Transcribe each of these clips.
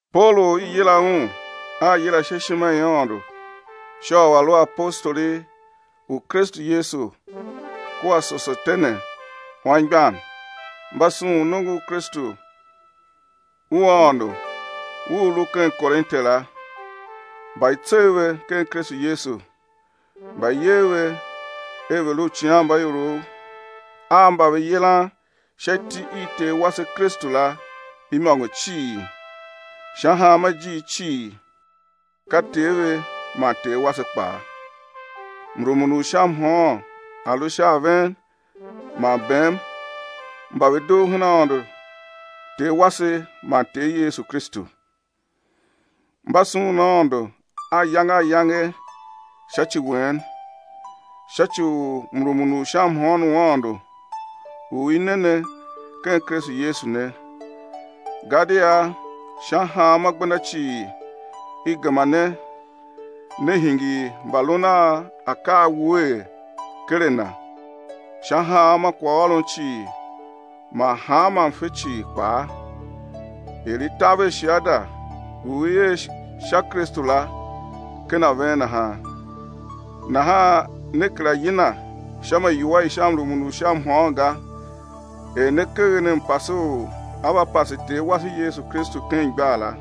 Paulu u i yila un a yila sha ishima i Aôndo sha u a̱ lu apostoli u Kristu Yesu, kua Sosetene, anmgbian, mba sughun nongo u Kristu u Aôndo u u lu ken Korinte la, mba i tsegh ve ken Kristu Yesu, mba i yer ve er ve̱ lu uicighanmbaiorov a mba ve yilan sha iti i Ter wase Kristu la imôngo cii, sha hanma ijiir cii, ka Ter ve man Ter wase kpaa; mrumun u sha mhôôn a̱ lu sha a ven man bem mba ve dugh ken Aôndo Ter wase man Ter Yesu Kristu. Mba sughun Aôndo ayange ayange sha ci wen, sha ci u mrumun u sha mhôôn u Aôndo u i ne ne ken Kristu Yesu ne, gadia sha hanma gbenda cii i gema ne ne hingir mbalun a akaa wuee ken a Na, sha hanma kwaghôron cii man hanma mfe cii kpaa— er i taver shiada u i er sha Kristu la ken a ven nahan— nahan ne kera yina sha ma iwua i sha mrumun u sha mhôôn ga, er ne keghen mpase u á va pase Ter wase Yesu Kristu ken igbar la,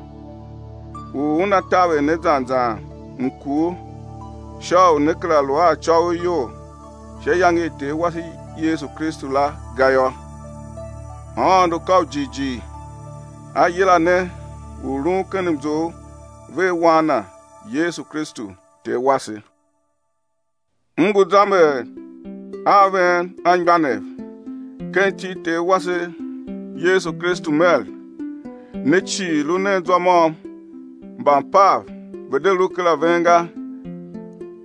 u Una taver ne zan zan mkur sha u né kera lu a acôghol iyol sha iyange i Ter wase Yesu Kristu la ga yô. Aôndo ka u jighjigh, A yila ne u lun ken mzough vea Wan Na Yesu Kristu Ter wase. M ngu zamber a ven anmgbianev, ken iti i Ter wase Yesu Kristu mer: Ne cii, lu nen zwa môm, mbampav ve̱ de lu her a ven ga,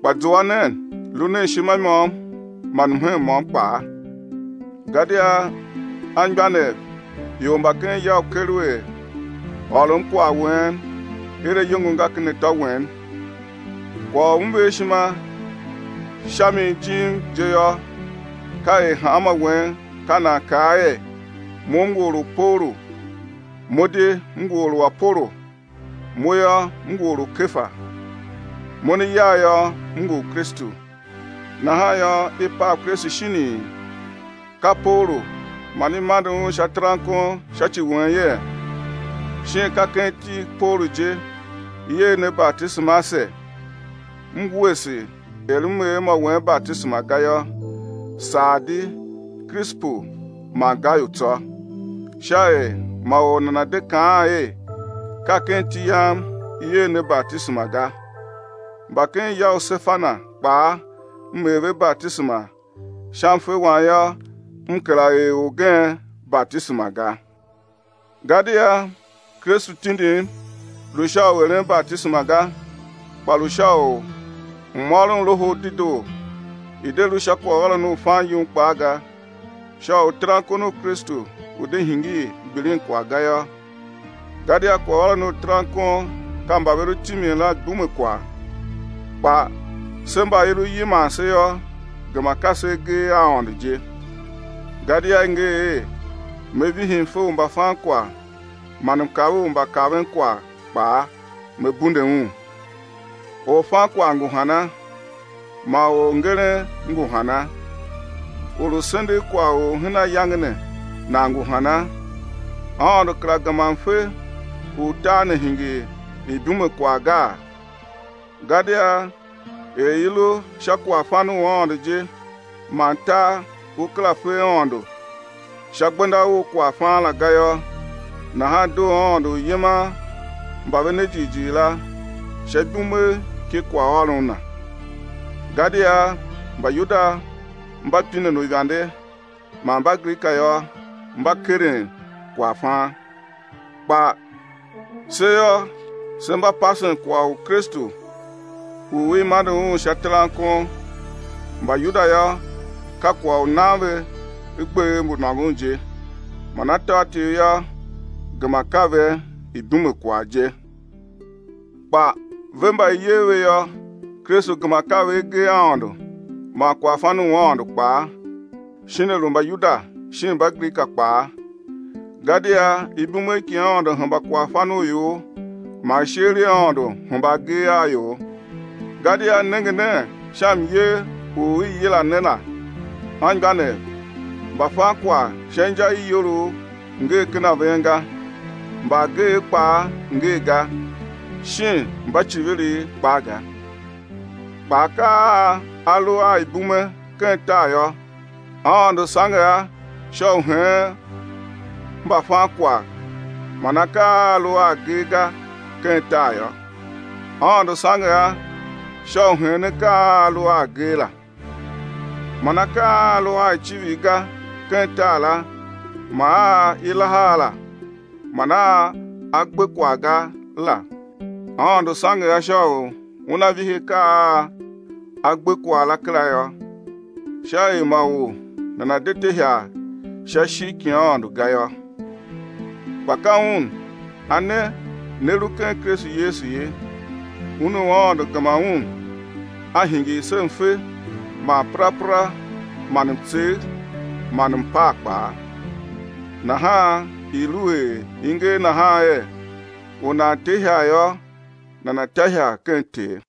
kpa zua nen, lu nen ishima i môm man mhen môm kpaa. Gadia, anmgbianev, ior mba ken ya u Kelue ôrom kwagh wen er ayongo nga ken atô wen. Kwagh u m ver ishima sha mi jim je yô, ka er hanmô wen ka nan kaa er: Mo m ngu or u Paulu, mo di m ngu or u Apolo, mo yô, m ngu or u Kefa, mo ne yagh yô, m ngu u Kristu. Nahan yô, i pav Kristu shinii? Ka Paulu man i mande un sha terankon sha ci wen yee? Shin ka ken iti i Paulu je i er ne batisema ase? M wuese er m er mô wen batisema ga yô, saa di Krisepu man Gayu tsô, sha er ma or nana̱ de kaan er: Ka ken iti yam i er ne batisema ga. Mba ken ya u Sefana kpaa, m er ve batisema, sha mfe wam yô, m kera er orgen batisema ga. Gadia Kristu tindim, lu sha u eren batisema ga, kpa lu sha u m ôron Loho u Dedoo, i̱ de lu sha kwaghôron u fan yum kpaa ga sha u terankon u Kristu u̱ de hingir gbilinkwagh ga yô. Gadia kwaghôron u terankon ka mba ve lu timin la ibumekwagh, kpa se mba i lu yiman se yô, gema ka se agee a Aôndo je. Gadia i nger er: Me vihi mfe u mbafankwagh, man mkav u mbakavenkwagh kpaa, Me bunde un. Orfankwagh ngu hana? Man orngeren ngu hana? Or u sendegh kwagh u hen ayange ne nan ngu hana? Aôndo kera gema mfe u tar ne hingir ibumekwagh gaa? Gadia er i lu sha kwaghfan u Aôndo je man tar u kera fe Aôndo sha gbenda u kwaghfan la ga yô, nahan doo Aôndo u yiman mba ve ne jighjigh la sha ibumegh ki kwaghôron Na. Gadia Mbayuda mba pinen uivande man Mbagrika yô, mba keren kwaghfan. Kpa se yô, se mba pasen kwagh u Kristu u i mande Un sha terankon; Mbayuda yô, ka kwagh u nan ve gbev mbu nôngon je, man atôatyev yô, gema ka ve ibumekwagh je. Kpa ve mba i yer ve yô, Kristu gema ka ve agee a Aôndo man kwaghfan u Aôndo kpaa, shin a lu Mbayuda, shin Mbagrika kpaa. Gadia ibumegh ki Aôndo hemba kwaghfan u ior man isheer i Aôndo hemba agee a ior. Gadia nenge nen sha myer u i yila ne la, anmgbianev, mbafankwagh sha inja i iyolough ngee ken ven ga, mbaageev kpaa ngee ga, shin mbaiciviriv kpaa ga. Kpa akaa a a lu a ibume ken tar yô, Aôndo sange a sha u heen mbafankwagh man akaa a a lu a agee ga ken tar yô, Aôndo sange a sha u heen akaa a a lu a agee la, man akaa a a lu a icivir ga ken tar la man a i laha a la, man a a gbe kwagh ga la, Aôndo sange a sha u Una vihi akaa a a gbe kwagh la kera yô, sha er ma or nana̱ de te ihagh sha ishigh ki Aôndo ga yô. Kpa ka Un A ne ne lu ken Kristu Yesu ye, Un u Aôndo gema Un A hingir se mfe man perapera man mtsegh man mpaa kpaa. Nahan i̱ lu er i nger nahan er: U nan te ihagh yô, nana̱ ta ihagh ken Ter.